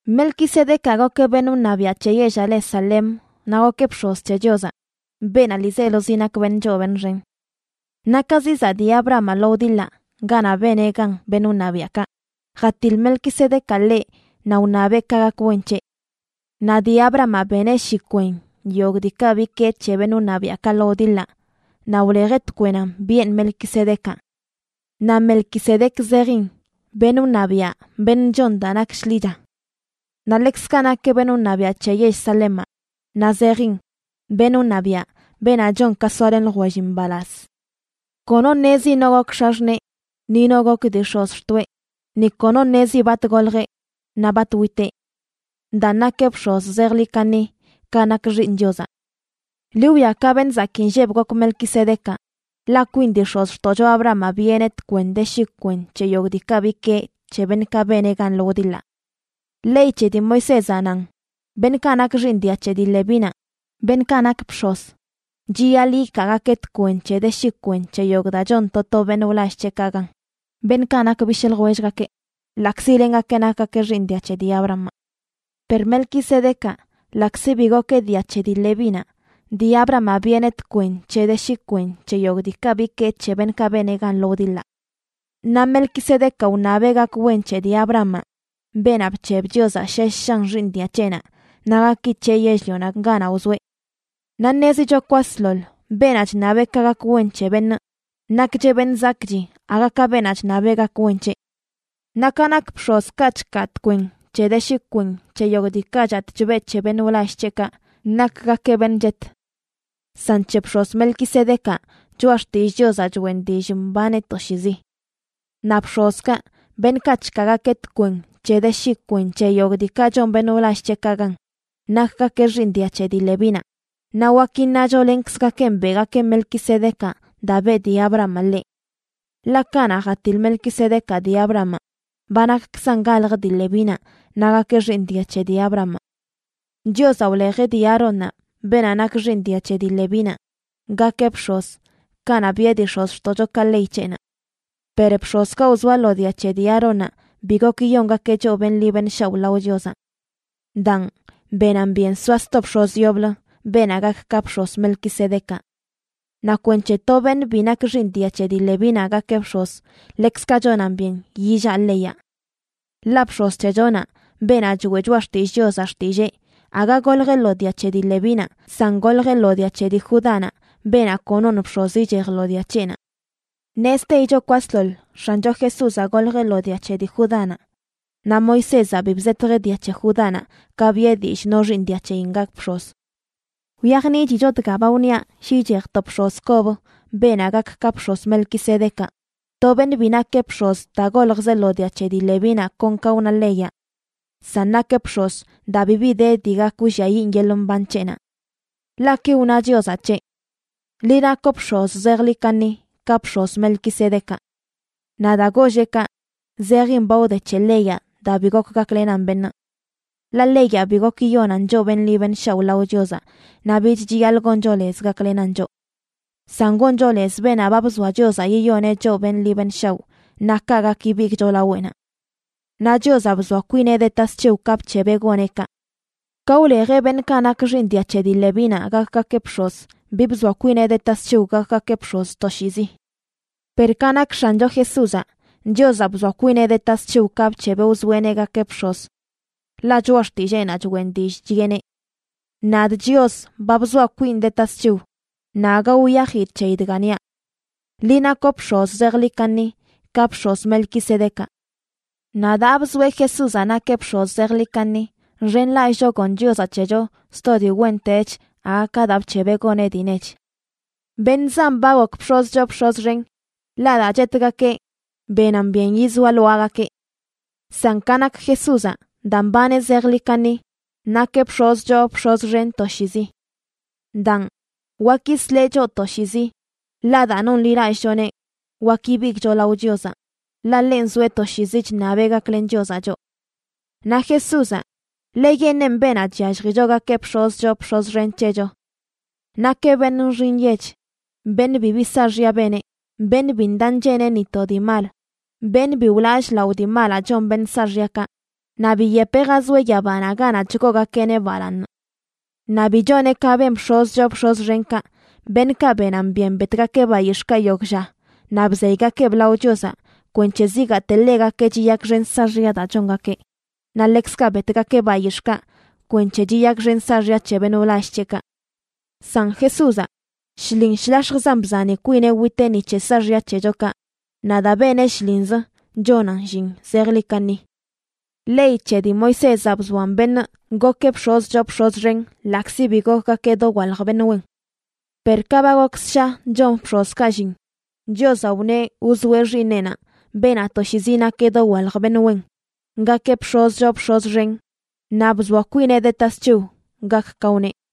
Melquisedecaꞌ gokeꞌ beṉꞌ wṉabiaꞌ c̱he yellaꞌ le Salem naꞌ gokeꞌ bx̱oz c̱he Chiozaꞌ, beenaꞌ ḻiizelozi nak beṉꞌ choo beṉꞌ xen. Naꞌ ka zizaꞌ dii Abrahamaꞌ lo wdiḻaꞌ ganaꞌ beneꞌ gan beṉꞌ wṉabiaꞌkaꞌ, jatiḻ Melquisedecaꞌ ḻeꞌ naꞌ wṉabeꞌ ka gak wen c̱heꞌ. Naꞌ dii Abrahamaꞌ beneꞌ shi kwen yogꞌ diikaꞌ bikee c̱he beṉꞌ wṉabiaꞌkaꞌ lo wdiḻaꞌ naꞌ wlejeꞌ tkwenana biꞌen Melquisedecaꞌ. Naꞌ Melquisedec zejin Beṉꞌ wṉabiaꞌ beṉꞌ chon daa nak shḻicha. Naꞌ ḻekzkaꞌ nakeꞌ beṉꞌ wṉabiaꞌ c̱he yell Salemaꞌ, naꞌ zejin beṉꞌ wṉabiaꞌ, beenaꞌ chon ka soalen ljwellin mbalaz. Kono ṉezi no gok x̱axṉee ni no gok dii x̱ozxtoꞌe, ni kono ṉezi bat goljeꞌ naꞌ bat witeꞌ. Daan nakeꞌ bx̱oz zejḻi kaṉi ka nak Xiiṉ Chiozaꞌ. Ḻi wwia ka beṉꞌ zakii nlleb gok Melquisedecaꞌ, ḻaꞌ kwin dii x̱ozxtoꞌcho Abrahamaꞌ biꞌeneꞌ tkwen c̱he de shi kwen c̱he yogꞌ diikaꞌ bikee c̱he beṉꞌkaꞌ beneꞌ gan lo wdiḻaꞌ. Ley c̱he dii Moisézaꞌ nan beṉꞌkaꞌ nak xiiṉ dia c̱he dii Levínaꞌ, beṉꞌkaꞌ nak bx̱oz, chiyaḻꞌ ikaagakeꞌ tkwen c̱he de shi kwen c̱he yogꞌ daa chon to to beṉꞌ wlall c̱heꞌkaꞌ gan, beṉꞌkaꞌ nak bishꞌ ljwellgakeꞌ, ḻaꞌkzi lengakeꞌ nakgakeꞌ xiiṉ dia c̱he dii Abrahamaꞌ. Per Melquisedecaꞌ, ḻaꞌkzi bi gokeꞌ dia c̱he dii Levínaꞌ, dii Abrahamaꞌ biꞌeneꞌ tkwen de shi kwen c̱he yogꞌ diikaꞌ bikee c̱he beṉꞌkaꞌ beneꞌ gan lo wdiḻaꞌ. Naꞌ Melquisedecaꞌ wṉabeꞌ gak wen c̱he dii Abrahamaꞌ, beenaꞌ bc̱heb Chiozaꞌ shesh shan xiiṉ dia c̱heꞌnaꞌ naꞌ gaki c̱heꞌ yell-lionaꞌ ganaꞌ wzoeꞌ. Naꞌ ṉezicho kwasḻoḻ beenaꞌ chṉabeꞌ ka gak wen c̱he beṉꞌ, nakcheꞌ beṉꞌ zakꞌchi aga ka beenaꞌ chṉab gak wen c̱heꞌ. Naꞌ ka nak bx̱ozkaꞌ chkaa tkwen c̱he de shi kwen c̱he yogꞌ diikaꞌ chatꞌ chbeꞌ c̱he beṉꞌ wlall c̱heꞌkaꞌ, nakgakeꞌ beṉꞌ chet. San c̱he bx̱oz Melquisedecaꞌ, Choꞌa Xtillꞌ Chiozaꞌ choꞌen dillꞌ mbaneꞌ toshiizi. Naꞌ bx̱ozkaꞌ, beṉꞌkaꞌ chkaagakeꞌ tkwen c̱he de shi kwen c̱he yogꞌ diikaꞌ chon beṉꞌ wlall c̱heꞌkaꞌ gan, nakgakeꞌ xiiṉ dia c̱he dii Levínaꞌ, naꞌ wak iṉacho lenkzgakenꞌ beꞌgakeꞌ Melquisedecaꞌ daa beꞌ dii Abrahamaꞌ ḻeꞌ, ḻaꞌ kanaꞌ jatiḻ Melquisedecaꞌ dii Abrahamaꞌ, ba nakkzan galj dii Levínaꞌ naꞌ gakeꞌ xiiṉ dia c̱he dii Abrahamaꞌ. Chiozaꞌ wlejeꞌ dii Aarónnaꞌ, beenaꞌ nak xiiṉ dia c̱he dii Levínaꞌ, gakeꞌ bx̱oz kanaꞌ biꞌe dii x̱ozxtoꞌchokaꞌ ley c̱heꞌnaꞌ. Per bx̱ozkaꞌ wzoa lo dia c̱he dii Aarónnaꞌ bi gok yiyongakeꞌ choꞌ beṉꞌ ḻi beṉꞌ shaoꞌ lao Chiozaꞌ. Daan, benan byen soa sto bx̱oz yoblə, beenaꞌ gak ka bx̱oz Melquisedecaꞌ. Naꞌ kwenc̱he to beṉꞌ bi nak xiiṉ dia c̱he dii Levínaꞌ gakeꞌ bx̱oz, ḻekzkaꞌ chonan byen yillaꞌ leyaꞌ. Ḻaꞌ bx̱oz c̱hechonaꞌ, beenaꞌ choeꞌ Choꞌa Xtillꞌ Chiozaꞌ xtillee, aga goljeꞌ lo dia c̱he dii Levínaꞌ, san goljeꞌ lo dia c̱he dii Judánaꞌ, beenaꞌ konoṉ bx̱oz ichej lo dia c̱heꞌnaꞌ. Ṉezteicho kwasḻoḻ X̱ancho Jesúzaꞌ goljeꞌ lo dia c̱he dii Judánaꞌ, naꞌ Moisézaꞌ bi bzetjeꞌ dia c̱he Judánaꞌ ka biꞌe dillꞌ no xiiṉ dia c̱heyin gak bx̱oz. Wyajniꞌchicho dga ba wniaꞌ shi ichej to bx̱oz kob, beenaꞌ gak ka bx̱oz Melquisedecaꞌ, to beṉꞌ bi nakeꞌ bx̱oz daa goljzeꞌ lo dia c̱he dii Levínaꞌ kon ka wna leyaꞌ, san nakeꞌ bx̱oz daa bibi de dii gak wlliayiꞌn yeḻꞌ mban c̱heꞌnaꞌ. Ḻaꞌ ki wna Chiozaꞌ c̱heꞌ: Liꞌ nakoꞌ bx̱oz zejḻi kaṉi, ka bx̱oz Melquisedecaꞌ. Naꞌ daa golleꞌ kaꞌ, zejin ba wde c̱he leyaꞌ daa bi gok gaklenan beṉꞌ. Ḻaꞌ leyaꞌ bi gok yiyonan choꞌ beṉꞌ ḻi beṉꞌ shaoꞌ lao Chiozaꞌ, naꞌ bich chiyaḻꞌ goncho lez gaklenan choꞌ. San goncho lez beenaꞌ ba bzoa Chiozaꞌ yiyoneꞌ choꞌ beṉꞌ ḻi beṉꞌ shaoꞌ, naꞌ kaꞌ gak ibigꞌcho laweꞌnaꞌ. Naꞌ Chiozaꞌ bzoa kwineꞌ de tasc̱hiw ka bc̱hebeꞌ goneꞌ kaꞌ. Ka wlejeꞌ beṉꞌkaꞌ nak xiiṉ dia c̱he dii Levínaꞌ gakgakeꞌ bx̱oz bi bzoa kwineꞌ de tasc̱hiw gakgakeꞌ bx̱oz toshiizi. Per ka nak X̱ancho Jesúzaꞌ, Chiozaꞌ bzoa kwineꞌ de tasc̱hiw ka bc̱hebeꞌ wzoeꞌneꞌ gakeꞌ bx̱oz, ḻaꞌ choꞌa xtilleenaꞌ choꞌen dillꞌ chiꞌeneꞌ: Nadꞌ Chios ba bzoaꞌ kwinꞌ de tasc̱hiw naꞌ aga wiyajidꞌ c̱heyi dga niaꞌ: “Liꞌ nakoꞌ bx̱oz zejḻi kaṉi, ka bx̱oz Melquisedecaꞌ.” Naꞌ daa bzoeꞌ Jesúzaꞌ nakeꞌ bx̱oz zejḻi kaṉi, nxenlallꞌcho gon Chiozaꞌ c̱hecho sto dii wentech aga ka daa bc̱hebeꞌ goneꞌ dii nech. Beṉꞌ zan ba gok bx̱oz choo bx̱oz xen, ḻaꞌ daa chetgakeꞌ benan byen yizoa lwaagakeꞌ. San ka nak Jesúzaꞌ, daa mbaneꞌ zejḻi kaṉi, nakeꞌ bx̱oz choo bx̱oz xen toshiizi. Daan, wak yisleꞌ choꞌ toshiizi, ḻaꞌ daa nonḻilallꞌchoneꞌ wak ibigꞌcho lao Chiozaꞌ, ḻaꞌ ḻenꞌ zoeꞌ toshiizi chṉabeꞌ gaklen Chiozaꞌ choꞌ. Naꞌ Jesúzaꞌ, ḻeyeṉꞌenꞌ beenaꞌ chyalljicho gakeꞌ bx̱oz choo bx̱oz xen c̱hecho. Nakeꞌ beṉꞌ nxi nyech, beṉꞌ bibi saaxya beneꞌ, beṉꞌ bi ndaꞌ ncheneꞌ ni to dii mal, beṉꞌ bi wlallꞌ lao dii malaꞌ chon beṉꞌ saaxyakaꞌ, naꞌ biyepeꞌ jazoeꞌ yabanaꞌ ganaꞌ chgoogakeꞌneꞌ balaaṉ. Naꞌ bi choneꞌ ka ben bx̱oz choo bx̱oz xenkaꞌ, beṉꞌkaꞌ benan byen betgakeꞌ bayix̱ꞌkaꞌ yogꞌ lla naꞌ bzeygakeꞌb lao Chiozaꞌ kwenc̱he zigaate ḻegakeꞌ chiyakxen saaxya daa chongakeꞌ, naꞌ ḻekzkaꞌ betgakeꞌ bayix̱ꞌkaꞌ kwenc̱he chiyakxen saaxya c̱he beṉꞌ wlall c̱heꞌkaꞌ. San Jesúzaꞌ, shlin shlax̱jzan bzani kwineꞌ witeꞌ ni c̱he saaxya c̱hechokaꞌ, naꞌ daa beneꞌ shlinz chonan llin zejḻi kaṉi. Ley c̱he dii Moisézaꞌ bzoan beṉꞌ gokeꞌ bx̱oz choo bx̱oz xen ḻaꞌkzi bi gokgakeꞌ dowalj beṉꞌ wen. Per ka ba gok ssha chon bx̱ozkaꞌ llin, Chiozaꞌ wneꞌ wzoeꞌ Xiiṉeꞌnaꞌ, beenaꞌ toshiizi nak dowalj beṉꞌ wen, gakeꞌ bx̱oz choo bx̱oz xen, naꞌ bzoa kwineꞌ de tasc̱hiw gak ka wneꞌ.